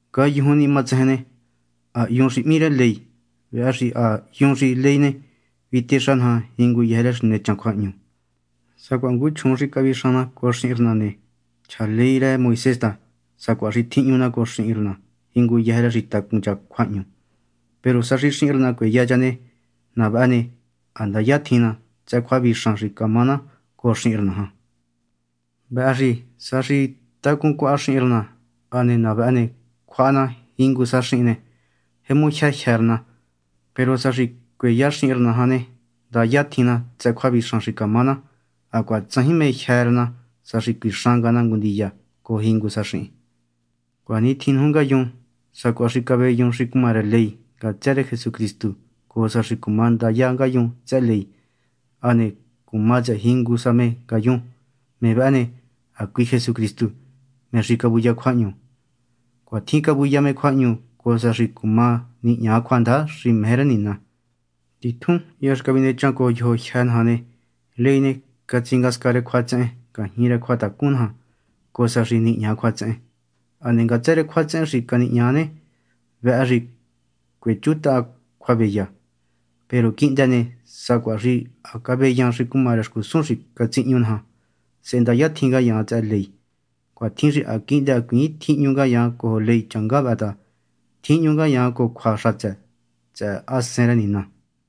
Ngayujun ni matsejen ne, ha hyun xi hmí rë ley. Vëhë xi ha hyun xi ley ne, vitexa naja jinguyëjë rë xi nechan cjuahñu. Sacuaha ngu chjuun xi cavixan na cojo xihin rë na ne, chja ley rë Moisés ta sacuaha xi tjihñu na cojo cha jinguyëjë rë xi tacun cha cjuahñu. Peru sa xi xihin rë na cueya cha ne, na vëhë ne, ha ndaya tjin na tsëhë cjuavixan xi camá na cojo xihin rë na jan. Vëhë xi sa xi tacun cuaha xihin rë na, hane na vëhë ne, cjuaha na jingu sa xihin ne, jemu jyë jyë́ rë na. Peru sa xi cueya xihin rë na jan ne, ndaya tjin na tsëhë cjuavixan xi camá na, hacuaha tsajin mé jyë́ rë na sa xi cuixan nga na ngu ndiya cojo jingu sa xihin. Cuanitjin nuju ngayun, sacuaha xi caveyun xi cuma rë ley ngatsë rë Jesucristu cojo sa xi cuma ndaya ngayun tsëhë ley, hane cuma tsëhë jingu sa me ngayun. Me vëhë ne, hacui Jesucristu, me xi cavuya cjuahñu. Cuatjin cavuya me cjuahñu cojo sa xi cuma nihña cjuandaja xi meje rë Nina. Titjun hya xi cavinechan cojo yojo jyë́ naja ne, ley ne, catsingasca rë cjuatsehen ngajñi rë cjuatacun naja cojo sa xi nihña cjuatsehen. Hane ngatsë rë cjuatsehen xi canihña ne, vëhë xi cuechuntahan cjuaveya. Peru quihndë ne, sacuaha xi caveyan xi cuma rë xcusun xi catsihñu naja, sehe ndaya tjin ngayaan tsëhë ley. Cuatjin xi ha quihndë hacuiin tjihñu ngayaan cojo ley changá vëhë ta, tjihñu ngayaan cojo cjua xatsë tsëhë Hasen rë Nina.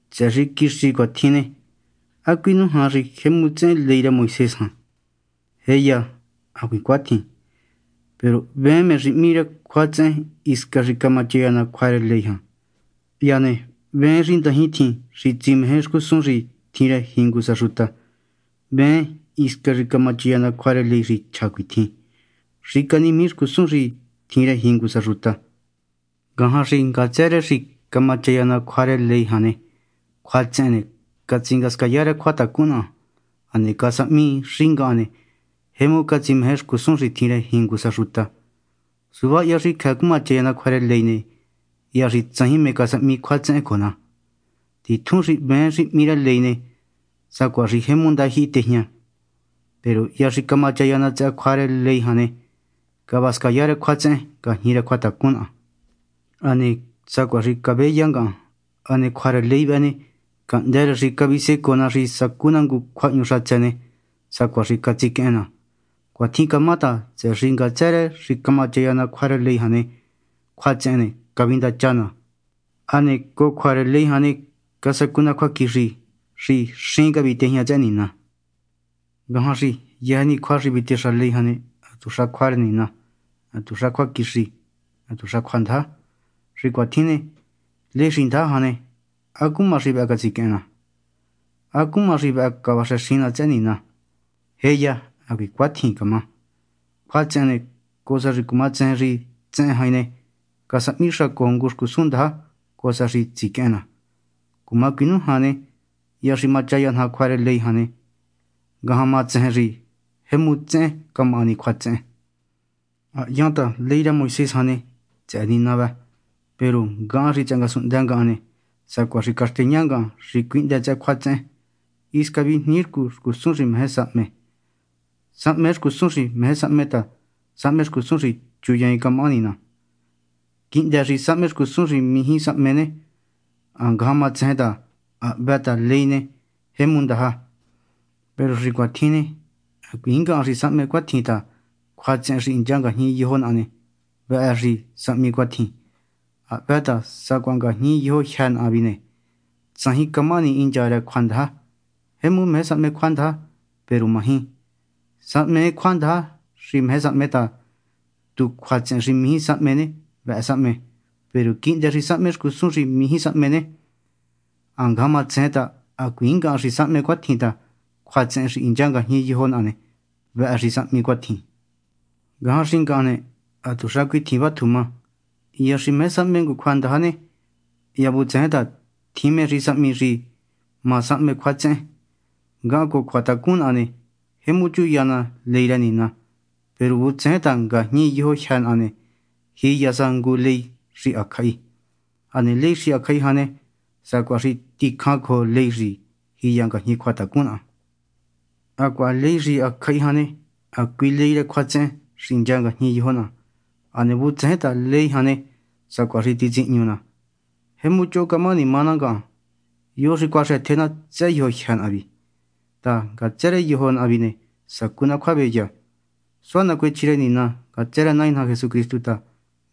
Tsëhë xi quixi cuatjin ne, ¿há cuinújan xi jemu tsehen ley rë Moisés jan? ¡Jéya, hacuiin cuatjin! Peru hveen mé xi hmí rë cjuatsehen hisca xi camachaya ná cjua rë ley jan. Hya ne hveen xi ndajin tjin xi tsimeje xcusun xi tjin rë jingu sa xuta, hveen hisca xi camachaya ná cjua rë ley xi chja cuitjin: “Xicanimiji xcusun xi tjin rë jingu sa xuta.” Ngajan xi ngatsë rë xi camachaya ná cjua rë ley jan ne, cjuatsehen ne, catsingasca rë cjuatacun naha, hane casahmi xi ngahan ne, jemu catsimeje xcusun xi tjin rë jingu sa xuta. Suva hya xi cjëë cumachaya ná cjua rë ley ne, hya xi tsajin mé casahmi cjuatsehen cojo ná. Titjun xi hveen xi hmí ley ne, sacuaha xi jemu ndajyihi tejña. Peru hya xi camachaya ná tsëhë cjua rë ley jan ne, cavascaya rë cjuatsehen ngajñi rë cjuatacun naha, hane sacuaha xi cavéya ngahan. Hane cjua rë ley vëhë ne, cahndë́ rë xi cavisecoo ná xi sacú ná ngu cjuahñu xatsë ne, sacuaha xi catsiquehen ná. Cuatjin camá ta, tsëhë xi ngatsë rë xi camachaya ná cjua rë ley jan ne, cjuatsehen ne, cavindacha ná. Hane cojo cjua rë ley jan ne, casacu ná cjuaquixi xi xín cavitejña tsëhë Nina. Ngajan xi yëjë ni cjua xi vitexa ley jan ne, hatuxa cjua rë Nina, hatuxa cjuaquixi, hatuxa cjuandaja. Xi cuatjin ne, ley xi ndaja jan ne, ¿há cuma xi vëhë catsiquehen ná? ¿Há cuma xi vëhë cavaxëxin ná tsëhë Nina? ¡Jéya, hacuiin cuatjin cama! Cjuatsehen ne, cojo sa xi cumatsejen xi tsehen jain ne, casahmi xa cojo ngu xcusun ndaja cojo sa xi tsiquehen ná. Cuma cuinújan ne, hya xi machaya naja cjua rë ley jan ne, ngajan ma tsejen xi jemu tsehen camahani cjuatsehen. Ha hyan ta ley rë Moisés jan ne, tsëhë Nina vë. Peru ngahan xi tsëhë ngasunhndë ngahan ne, sacuaha xi caxteña ngahan xi cuíhndë tsëhë cjuatsehen. Hisca vijniircú xcusun xi sahme. Sahmee xcusun xi meje sahme ta sahme xcusun xi chuyiin camahani ná. Quihndë xi sahme xcusun xi mijí sahme ne, ha ngajan ma tsejen ta ha hvë ta ley ne, jemu ndaja. Peru xi cuatjin ne, hacuiin ngahan xi sahme cuatjin ta cjuatsehen xi hincha ngajñi yojo naha ne, vëhë xi sahmi cuatjin. Ha hvë ta sacuaha ngajñi yojo jyë́ naha vi ne, tsajin camahani hincha rë cjuandaja. Jemu meje sahme cjuandaja, peru maji. Sahmee cjuandaja xi meje sahme ta tu cjuatsehen xi mijí sahme ne, vëhë sahme. Peru quihndë xi sahme xcusun xi mijí sahme ne, ha ngajan ma tsejen ta hacuiin ngahan xi sahme cuatjin ta, cjuatsehen xi hincha ngajñi yojo naha ne, vëhë xi sahmi cuatjin. Ngajan xi ngahan ne, hatuxa cuitjin vátju má: hya xi meje sahme ngu cjuandaja ne, hya vutsején ta tjin mé xi sahmi xi ma sahme cjuatsehen. Ngahan cojo cjuatacun naha ne, jemu chuya ná ley rë Nina. Peru vutsején ta ngajñi yojo jyë́ naha ne, jiya sa ngu ley xi hacjahi. Hane ley xi hacjahi jan ne, sacuaha xi ticjan cojo ley xi jiya ngajñi cjuatacun naha. Hacuaha ley xi hacjahi jan ne, hacui ley rë cjuatsehen xi hincha ngajñi yojo naha. Hane vutsején ta ley jan ne, sacuaha xi titsihñu ná. ¡Jemu choho camahani má ná ngahan! ¿Yo xi cuaxëtje ná tsëhë yojo jyë́ naha vi ni? ta, ngatsë rë yojo naha vi ne, sacú ná cjuaveya. Suá nacuechji rë Nina ngatsë rë Nai naja Jesucristu ta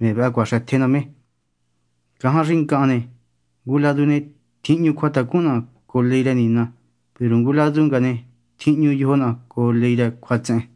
me vëhë cuaxëtje ná me. Ngajan xi ngahan ne, ngu ladu ne, tjihñu cjuatacun naha cojo ley rë Nina, peru ngu ladu nga ne, tjihñu yojo naha cojo ley rë cjuatsehen.